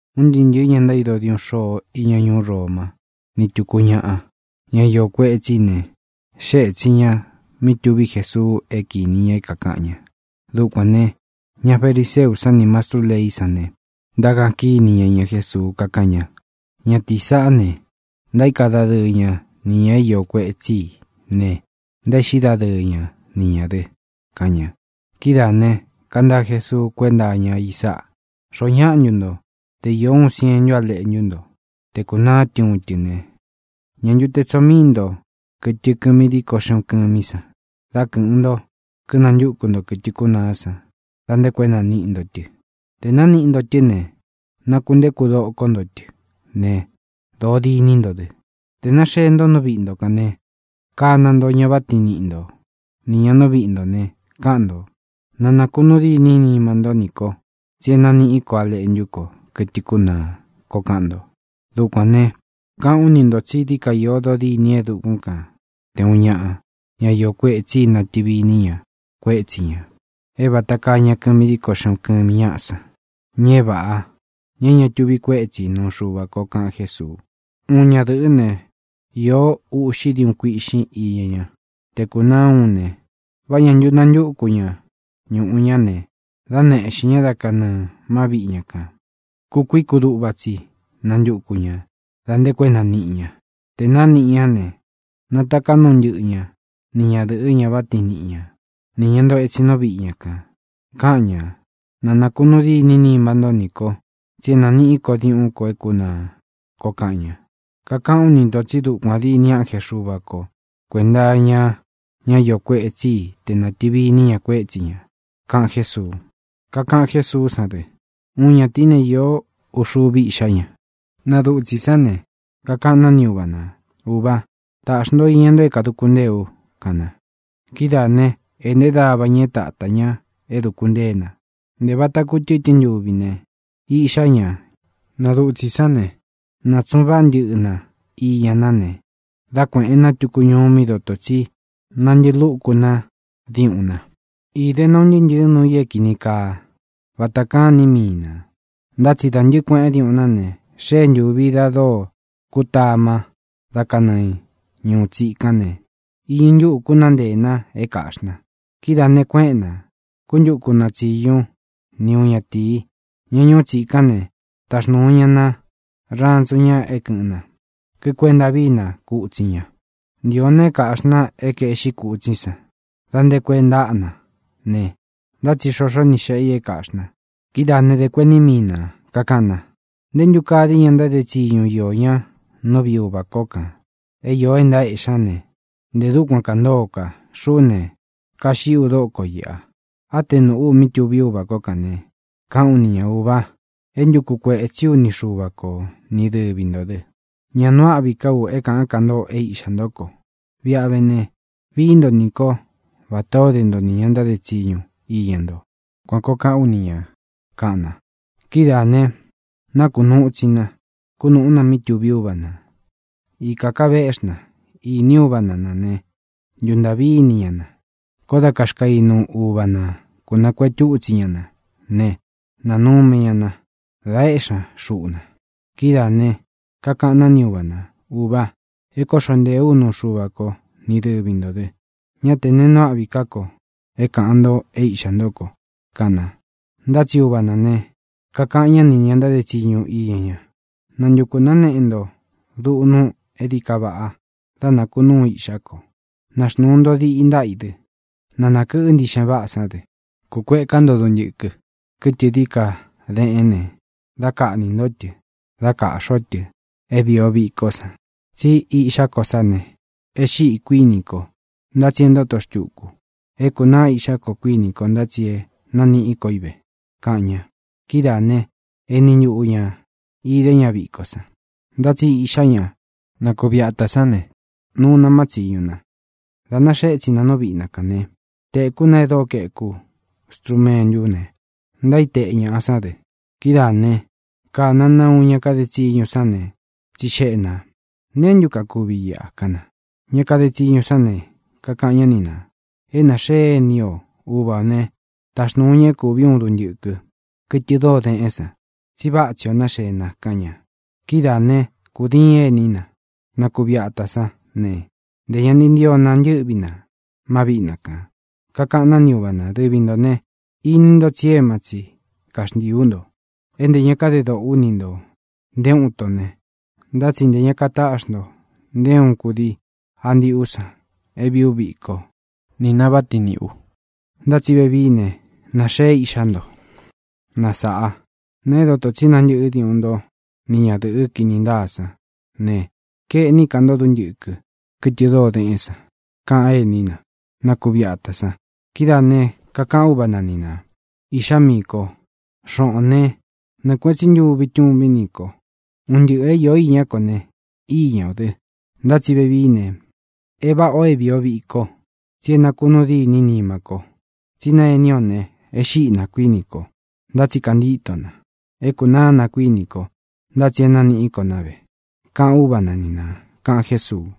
Un ntɨɨ́ ntɨ̄ɨ ña ntaído diuꞌun xôo iña ñuú Roma ni túku ñaꞌa, ña é iō kuetsí i ne, xée ētsin ña mí tuví Jesuu é kīni ña é kākaꞌan ña. Dukuān ne, ña fariseú san nī mastrú leí san ne, ntákaꞌan kíni ña iña Jésuu, kakáꞌan ña: —Ñatīí saꞌá ne, ntaíka dadɨɨ ña nī ña é iō kuetsí i ne, ntaéꞌxí dadɨɨ ña ni ñā dɨ —kaꞌan ña. Kidáā ne, kantaa Jesuu kuénta iña i sáꞌā: —¿Xoó ñaꞌa ntu nto, te īó uun sientu léꞌntu ntó, tē kunaá tɨ uun tɨ ne, ñā ntu te tsoo míi nto kɨtɨ kɨmi díko xeꞌun kɨmí san, dá kɨ̄ꞌɨn nto, kínantúku nto kɨ̄tɨ kúnaá san da nte ko é naniꞌi nto tɨ? Tē nániꞌi ntó tɨ ne, nakuntéku dokó nto tɨ ne, dōo dîní nto dɨ. Tē náxee nto nú viꞌi nto kān ne, kana nto ña váꞌa tiin niꞌi nto nī ña nú viꞌi ntō ne, káꞌan ntō: “Na nākunuu dîní nima ntó nī ko, tsí e nániꞌí ko á leꞌntú ko, kɨtɨ kúnaa”, koo kaꞌan nto. Dukuān ne, káꞌān ú ni ntō tsí dií ka iō dodîní e dukún kān te uun ñāꞌa, ñá iō kuetsí i, natɨvi iní ña kuétsi ñā, é vāta kaa ña kɨmi díko xeꞌun kɨmi ñáꞌa san, ña é vāꞌa, ña é ña tuvi kuétsi ī nuu Xuva ko —kaꞌan Jésuu—. ʼUun ñadɨ̄ꞌɨ́ ne, īó uꞌxi diuꞌun kuiꞌxín iña ña. Tē kúnaa úun ne, ¿vá ñā ntu natúun ña ñuꞌu ña ne, dá neꞌxīn ñá da kanɨɨ̄ má viꞌi ña kān? Kukuií kuduꞌva tsi nantuku ñā da nte ko é naniꞌi ña. Tē nániꞌi ñá ne, nataká nuu ntɨꞌɨ ña ni ñadɨ̄ꞌɨ, ña váꞌa tiin niꞌi ña, nī ña ntoo etsin nú viꞌi ña kān, káꞌan ñā: “Nā nakunuu díni nima ntó nī kó, tsi é nāniꞌí ko diuꞌún ko e kúnaa”, koo kaꞌan ña. Kakaꞌán u ni ntō tsí dukuān dîni ánje Xuva ko kuēnta iña ñá iō kuetsí i tē nátɨvi iní ña kuétsi ñā —kaꞌan Jésuu. Kakaꞌan Jésuú san dɨ: —Uun ñatīí ne, īó uvi iꞌxá ña. Na dutsī sán ne, kakaꞌan ná ni uva nā: “Ūvá, taꞌxi nto iña nto é kāduku ntée u”, kaꞌan na. Kidáa ne, ēꞌnté dava ña é tātá ña é duku ntée na. Ntē vata kutɨ́tɨn ntuvi ne, iꞌxá ña, na dutsī sán ne, nātsuꞌun váꞌa ntɨꞌɨ na íña ná ne, dá kuēꞌen ná tuku ñuú mí doto tsi nántɨꞌɨ lúku na diuꞌun na. Īde na un ntɨɨ́ ntɨ̄ɨ núu i é kīni kaa vata kaꞌán ini míi nā. Ntá tsi dā ntɨ́ꞌɨ kuēꞌen diuꞌun ná ne, xée ntūvi da dóo kutama da kanɨɨ ñūu tsíkán ne, iñɨ ntúꞌū kúnaa nteē na é kāꞌxí na. Kidáā ne, kuéꞌen nā, kuntúku na tsiñu ni uun ñatīi, ña ñuú tsikán ne, taxnūu ña ná rantsu ña é kɨ̄ꞌɨn na, kikuenta víi na kutsin ña. Ntīo na é kāꞌxí na é kaeꞌxí kutsín san da nte ko é ntaꞌa na ne, ntá tsi xoxo ni xéꞌe ī é kāꞌxí na. Kidáā né, dē kuení mii na, kākaꞌan na: “¡Nté ntu kaa dií ña ntáde tsiñu iō ñá nú viꞌi uvā kó kān é iō é ntaéꞌxí ña ne, ntē dúkuan kāntóo ka. Xuꞌú ne, kaxiꞌí u dóko iꞌa! Á te nūꞌú u mí tuví uvā kó kān ne, káꞌān ú ni ñā: Ūva, é ntuku kuētsí u ni Xuva ko, ni dɨvi ntō dɨ. Ña nuu áꞌvi ká u é kāꞌán ka nto é iꞌxā ntó ko. Viꞌi a vé ne, vií nto nī kó vatā ó de nto nī ña ntáde tsiñu iña nto. Kuan kōo káꞌān ú ni ñā”, kaꞌan na. Kidáā ne, nákunūu itsi na, kunúꞌu na mí tuví uva nā. ʼIkā ká veꞌxí na, íni uva na nā né, ntuntāꞌví ini ña na. Koó da kaxkainu uva nā kúnakuētú itsi ña na ne, nánume ña na, da éꞌxi ña xuꞌu na. Kidáā ne, kakaꞌan ná ni uva nā: “Ūva, é kōꞌxo nteé u nuu Xuva ko, ni dɨvi ntō dɨ. Ñá tē nee nuu áꞌvi ká ko é kāꞌán nto é īꞌxá nto ko”, kaꞌan na. Ntá tsi uva nā ne, kakaꞌan ñá ni ña ntáde tsiñu iña ña: “Nantukū náneꞌe nto duꞌnu é dií ka vaꞌa dá nākunúu iꞌxá ko. Naxnūu nto diꞌi ntáꞌa i dɨ. Na nākɨꞌɨ́ ntiꞌxen váꞌā sán dɨ. Kūkueká nto duntɨkɨ, kɨtɨ dií ka deꞌén ne, dá kaꞌnī ntó tɨ dá kāꞌxi o tɨ é vīi o vikó san. Tsí iꞌxá ko sá ne, e xíꞌi, kuíni ko, ntá tsi e ntóto xtuku. É kūnaá iꞌxá ko, kuíni ko, ntá tsi é naniꞌí ko i ve”, kaꞌan ña. Kidáa ne, eni ntuꞌu ñā idé ña viko san. ʼNtá tsi iꞌxá ña, na kuvi atā sán ne, nuu na má tsīñu na. Dā náxee étsin na nú viꞌi na kān né, tēkú na e dóo kaeku strumentú ne, ntaíteꞌe ñaꞌa sán dɨ. Kidáā né, kāna na uun ña kade tsiñu sán ne, tsixeꞌe nā: “¿Neé ntu kakuvi iꞌa?”, kaꞌan na. Ña kade tsiñu sán ne, kakaꞌan ñá ni nā: “É nāxee ení o. Uva ō ne, táxnūu ña é kūví uun duntɨkɨ, kɨtɨ dóo deꞌén san, tsi váꞌa tsi ō náxee na”, kaꞌan ña. Kidáa ne, kūdiín ení na, na kuvi atā sán ne, ntē ña ni ntio na ntɨ́ꞌvi na má viꞌi na kān. Kakaꞌan ná ni uva nā: “Dɨvi ntō ne, ini nto tsi éma tsi kaxntiī ú nto, é ntē ña kadé doꞌō ú ni ntō nté uun ito ne. Ntá tsi ntē ña kataꞌxí nto nté uun kudii a ndiꞌú san é vīí u viko ko nī na váꞌa tiin niꞌī u. Ntá tsi vevií ne, nāxee iꞌxá nto na sāꞌá, na é dotō tsí nantɨꞌɨ́ diuꞌun nto ni ñadɨ̄ꞌɨ́ kinī ntáa sán ne, kaeꞌní ka nto duntɨkɨ, kɨtɨ dóo deꞌén san”, kaꞌan ení na, na kuvi atā san. Kidáā ne, kakaꞌan úva na ni nā: “Iꞌxá miī kó, xoꞌōn né, nɨɨ̄ kueꞌen tsí ntuvi tuvín nī kó. Un ntɨꞌɨ̄ é īó iñá ko ne, íña ō dɨ. Ntá tsi vevií ne, e váꞌa ō é vīi o víko, tsi é nakūnuu dîní nimá ko, tsí na ení o ne, e xíꞌi na, kuíni ko, ntá tsi kantíto na. É kūnáa na, kuíni ko, ntá tsi é naniꞌí ko ná ve”, kaꞌan úva na ni nā —kaꞌan Jésuu.